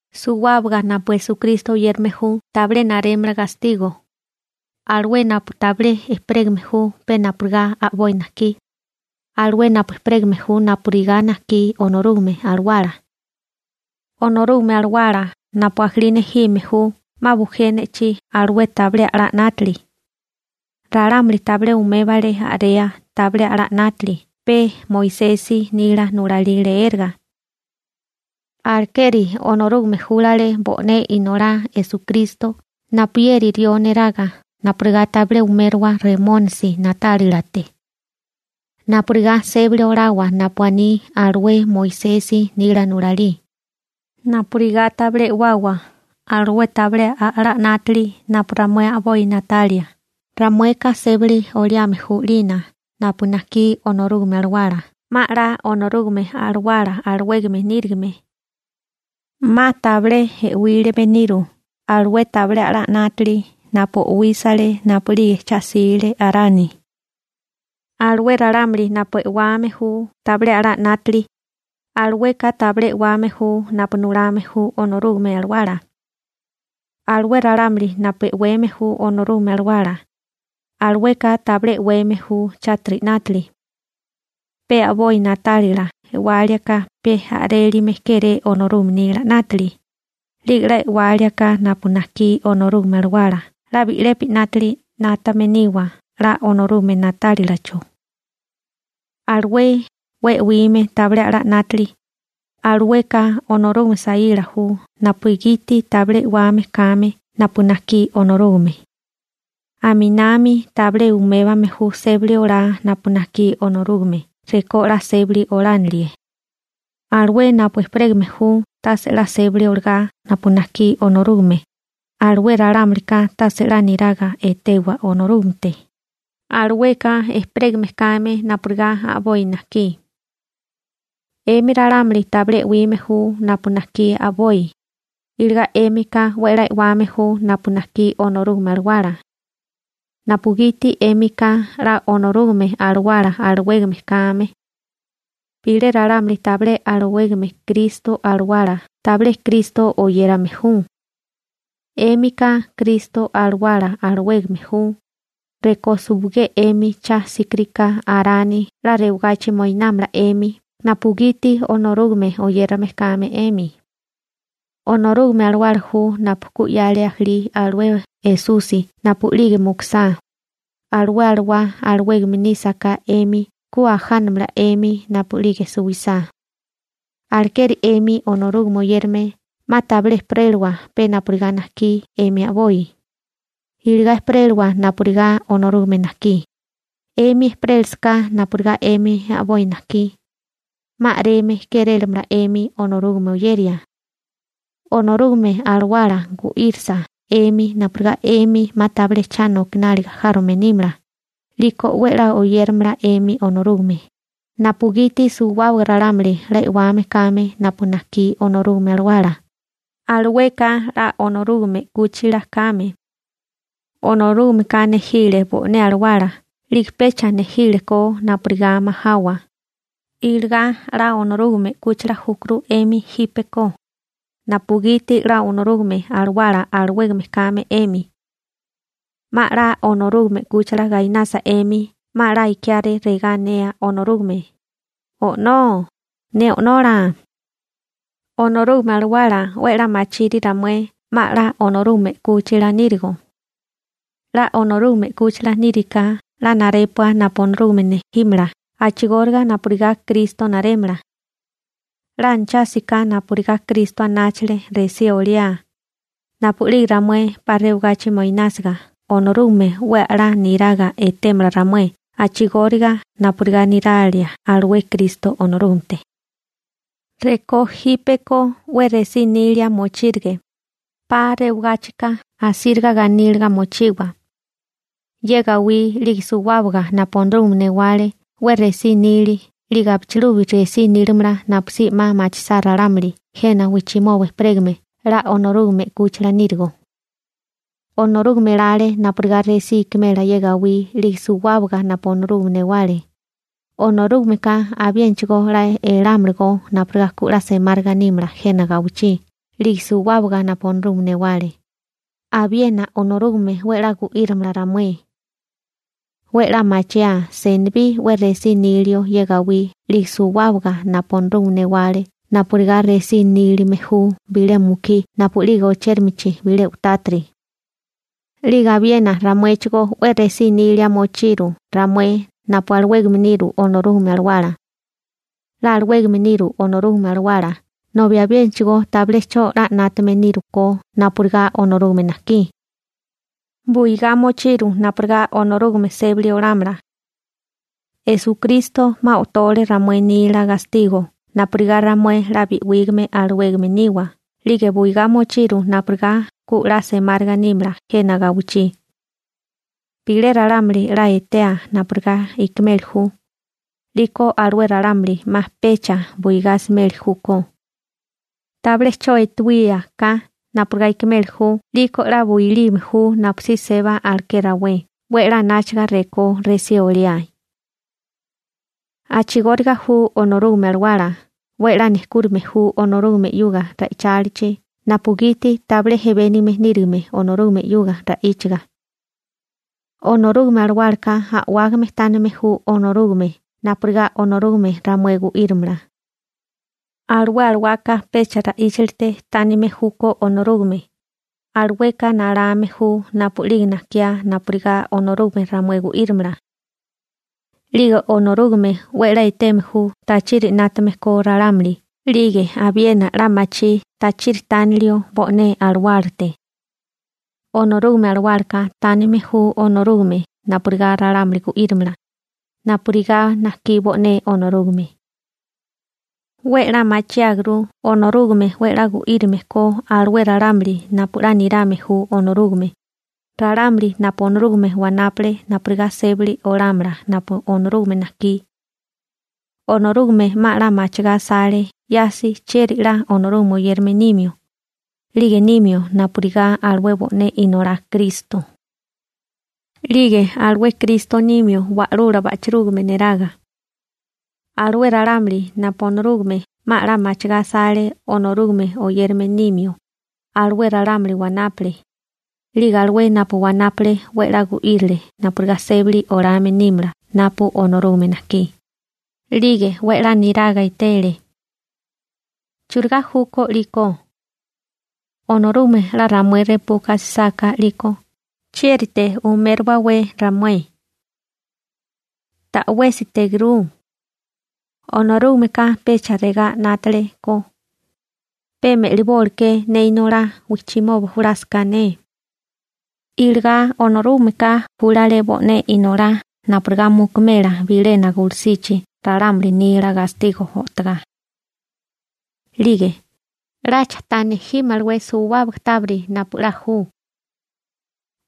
Suwábaga napu Kristo Esusi oyérame ju tabilé narémala gastigo, alué napu tabilé ejperégame ju pe napurigá a'boi najkí, alué napu ejperégame ju napurigá najkí Onorúgame Alawala. Onorúgame Alawala napu ajalí nejime ju 'ma bujé ne'chí alué tabilé a'lá 'nátili. Ralámuli tabilé umébale a'rea tabilé a'lá 'nátili pe Moisesi nila nulalí leéraga. Alekeri Onorúgame júlale bo'né Inolá Esukristo napuyeri rió neraga napurigá tabilé umérowa Remónisi na'tálilate. Napurigá sébali olawa napu aní alué Moisesi nila nulalí, napurigá tabilé e'wawa alué tabilé a'lá 'nátili napu ramué a'boi na'talia, ramueka sébali oliame ju 'lina napu najkí Onorúgame Alawala 'ma 'la Onorúgame Alawala alawégame nírigime. 'Ma tabilé e'wílime niru alué tabilé a'lá 'nátili napu o'wísale napu'lige cha 'sile Arani. Alué ralámuli napu e'wame ju tabilé a'lá 'nátili, alueka tabilé e'wame ju napu nulame ju Onorúgame Alawala. Alué ralámuli napu e'weme ju Onorúgame Alawala, alueka tabilé e'weme ju chátiri 'nátili. Pe a'boi na'tálila e'walíaká pe a'rilime kéré Onorúgame nila 'nátili, 'lige 'la e'walíaká napu najkí Onorúgame Alawala 'la bi'lepi 'nátili 'nátame niwa 'la Onorúgame na'tálilacho. Alué 'we e'wime tabilé a'lá 'nátili, alueka Onorúgame saíla ju napugiti tabilé e'wame kame napu najkí Onorúgame. Aminami tabilé umébame ju sébali olá napu najkí Onorúgame rekó 'la sébali olánilie. Alué napu ejperégame ju tase 'la sébali olagá napu najkí Onorúgame, alué ralámulika tase 'la niraga etewa Onorúgamete, alueka ejperégame kame napurigá a'boi najkí. 'Emi ralámuli tabilé e'wime ju napu najkí a'boi, iligá 'émika 'we 'la e'wame ju napu najkí Onorúgame Alawala napugiti 'émika 'la Onorúgame Alawala alawégame kame. Bilé ralámuli tabilé alawégame Kristo Alawala tabilé Kristo oyérame ju. 'Émika Kristo Alawala alawégame ju, rekó suwigé 'emi cha 'síkiriká Arani 'la rewagachi moinámala 'emi napugiti Onorúgame oyérame kame 'emi. Onorúgame Alawala ju napu ku 'yale ajalí alué Esusi napu'lige mukusá, alué alawá alawégame nísaká 'emi ku ajánamala 'emi napu'lige suwisá. Alekeri 'emi Onorúgame oyérame 'ma tabilé ejperélawa pe napurigá najkí 'emi a'boi, iligá ejperélawa napurigá Onorúgame najkí, 'emi ejperélasaká napurigá 'emi a'boi najkí, 'ma a'reme kérélamala 'emi Onorúgame oyeria. Onorúgame Alawala 'la gu'írisa 'emi napurigá 'emi 'ma tabilé cha nokináliga járome nímala, 'liko 'we 'la oyéramala 'emi Onorúgame, napugiti suwábaga ralámuli 'la e'wame kame napu najkí Onorúgame Alawala, alueka 'la Onorúgame 'kúchila kame. Onorúgameka nejile bo'né alawala 'lige pecha nejílekó napurigá majawa, iligá 'la Onorúgame 'kúchila júkuru 'emi jípeko napugiti 'la Onorúgame Alawala alawégame kame 'emi. 'Ma 'la Onorúgame 'kúchila gainasa 'emi 'ma 'la ikiáré regá anea Onorúgame: «¡O'nó, ne O'nola!» Onorúgame Alawala 'we 'la machiri ramué 'ma 'la Onorúgame 'kúchila nírigo. 'La Onorúgame 'kúchila níriká 'la narépua napu Onorúgame nejímala a'chigóriga napurigá Kristo narémala. 'La anachásiká napurigá Kristo anáchale resí oliá, napu'lige ramué 'pa rewagachi moinásiga Onorúgame 'we a'lá niraga etémala ramué a'chigóriga napurigá niralia alué Kristo Onorúgamete. Rekó jípeko 'we resí nilia mochírige, 'pa rewagáchika asíriga ganíliga mochiwa. Ye gawí 'lige suwábaga napu Onorúgame newale 'we resí nili 'lige abichilubi resí nílamala napusí 'ma machisá ralámuli jena wijchimoba ejperégame 'la Onorúgame 'kúchila nírigo. Onorúgame elale napurigá resí ikimela ye gawí 'lige suwábaga napu Onorúgame newale, Onorúgameka abiénachigo 'la elámalagó napurigá ku 'la semáriga nímala jena gawichí 'lige suwábaga napu Onorúgame newale, abiena Onorúgame 'we 'la gu'írimala ramué. 'We 'la machiáa senibí 'we resí nilio ye gawí 'lige suwábaga napu Onorúgame newale napurigá resí nílime ju bilé mukí napu'lige ochérimichi bilé u'tátiri. 'Lige abiena ramuéchigó 'we resí nilia mochiru ramué napu alawégame niru Onorúgame Alawala. 'La alawégame niru Onorúgame Alawala nobi abiénachigo tabilé 'cho 'la 'nátame nírukó napurigá Onorúgame najkí. Buigá mochiru napurigá Onorúgame sébali olámala. Esukristo 'ma o'tole ramué nila gastigo napurigá ramué 'la bi'wígame alawégame niwa 'lige buigá mochiru napurigá ku 'la semáriga nímala jena gawichí. Bilé ralámuli 'la etea napurigá ikimeli ju, 'liko alué ralámuli 'ma pecha buigá asimeli júkó. Tabilé 'cho etewía ka napurigá ikimeli ju 'liko 'la builime ju napusí seba aleké rawé 'we 'la anáchaga rekó resí oliae. A'chigóriga ju Onorúgame Alawala 'we 'la nejkúrime ju Onorúgame 'yuga ra'ichálichi napugiti tabilé ejebénigame nírigime Onorúgame 'yuga ra'íchaga. Onorúgame Alawálaka a'wágame tánime ju Onorúgame napurigá Onorúgame ramué gu'írimala. Alué alawaka pecha ra'íchalite tánime júkó Onorúgame, alueka nalame ju napu'lige najkiá napurigá Onorúgame ramué gu'írimala. 'Lige Onorúgame 'we 'la eteme ju tachiri 'nátame ko ralámuli 'lige abiena 'la machí tachiri tánilio bo'né alawálate. Onorúgame Alawálaka tánime ju Onorúgame napurigá ralámuli gu'írimala, napurigá najkí bo'né Onorúgame. 'We 'la machiáguru Onorúgame 'we 'la gu'írime ko alué ralámuli napu 'la nirame ju Onorúgame, ralámuli napu Onorúgame wanápale napurigá sébali olámala napu Onorúgame najkí. Onorúgame 'ma 'la machigá asale 'yasi chieri 'la Onorúgame oyérame nimio, 'lige nimio napurigá alué bo'né Inolá Kristo. 'Lige alué Kristo nimio wa'lula ba'chirúgame neraga. Alué ralámuli napu Onorúgame 'ma 'la machigá asale Onorúgame oyérame nimio, alué ralámuli wanápale, 'lige alué napu wanápale 'we 'la gu'írile napurigá sébali olame nímala napu Onorúgame najkí, 'lige 'we 'la niraga etele. ¿Churigá júkó 'liko? Onorúgame 'la ramué repuka asisáká, 'liko ¿chiérite umériwawé ramué? ¡Ta'wésitegurú! Onorúgameka pecha regá 'nátale ko: «Pe me'libóleké ne Inolá wijchimoba julásaká ne.» Iligá Onorúgameka júlale bo'né Inolá napurigá mukumela bilena gulusichi ralámuli nila gastigo o'togá. 'Lige ¿'lacha ta nejímalawé suwábaga tábiri napu 'la ju?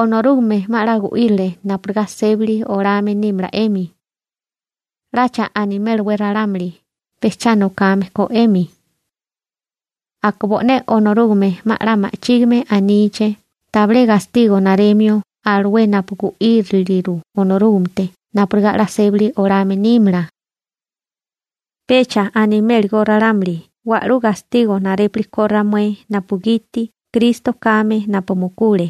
Onorúgame 'ma 'la gu'írile napurigá sébali olame nímala 'emi. ¿'Lacha animélawé ralámuli pe cha nokame ko 'emi? ¿Aka bo'né Onorúgame 'ma 'la ma'chígime aníché tabilé gastigo naremio alué napu gu'íriliru Onorúgamete napurigá 'la sébali olame nímala? Pecha animélagó ralámuli wa'lú gastigo narépuli ko ramué napugiti Kristo kame napu mukule,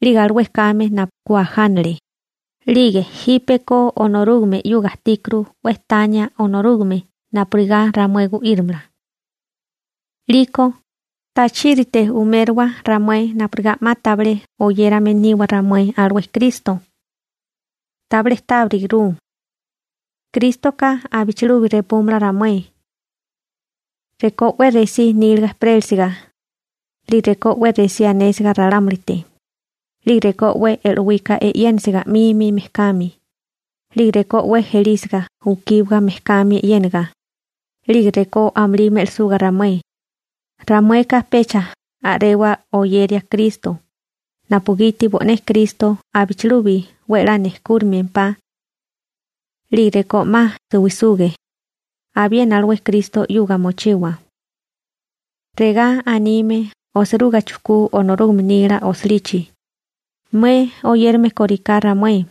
'lige alué kame napu ku ajánale, 'lige jípeko Onorúgame 'yuga ajtíkuru 'we tania Onorúgame napurigá ramué gu'írimala. 'Liko ¿tachírite umériwa ramué napurigá 'ma tabilé oyérame niwa ramué alué Kristo? Tabilé tábirigurú. Krístoka abichilubi repúmala ramué. Rekó 'we resí níliga ejperélisiga, 'lige rekó 'we resí anésiga ralámulite, 'lige rekó 'we e'lowika e'yénisiga 'mimi mejkami, 'lige rekó 'we ejelísiga ukíbaga mejkami e'yénaga, 'lige rekó amulí me'lisuga ramué, ramueka pecha a'rewa oyeria Kristo napugiti bo'né Kristo abichilubi 'we 'la nejkúrimempá. 'Lige rekó 'ma suwisuge, abiena alué Kristo 'yuga mochiwa. Regá anime osiruga chujkú Onorúgame nila osilichi: Mué oyérame kóriká ramué,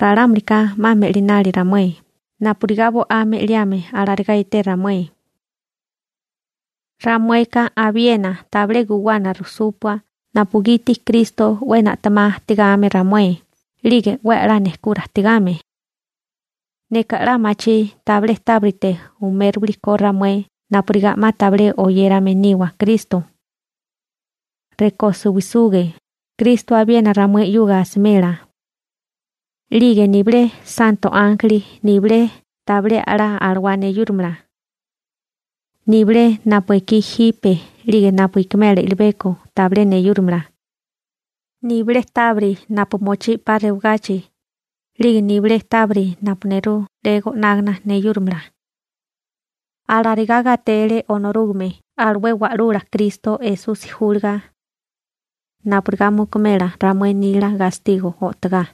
ralámulika 'ma me'linali ramué napurigá bo'á napu ju me'liboli alarigá eté ramué. Ramueka abiena tabilé guwana rujsúpua napugiti Kristo 'we na'temá ajtigame ramué 'lige 'we a'lá nejkura ajtigame. Neka 'la machí tabilé tábirite umériwilikó ramué napurigá 'ma tabilé oyérame niwa Kristo. Rekó suwisuge, Kristo abiena ramué 'yuga asimela. 'Lige nibilé santo ánjeli nibilé tabilé a'lá alawá neyúramala. Nibilé napu ekí jipe 'lige napu ikimela i'libeko tabilé neyúrimala. Nibilé tábiri napu mochí 'pa rewagachi, 'lige nibilé tábiri napu nerú 'le go'nágana neyúrimala. Alarigá gatele Onorúgame alué Wa'lula Kristo Esusi júlaga napurigá mukumela ramué nila gastigo o'togá.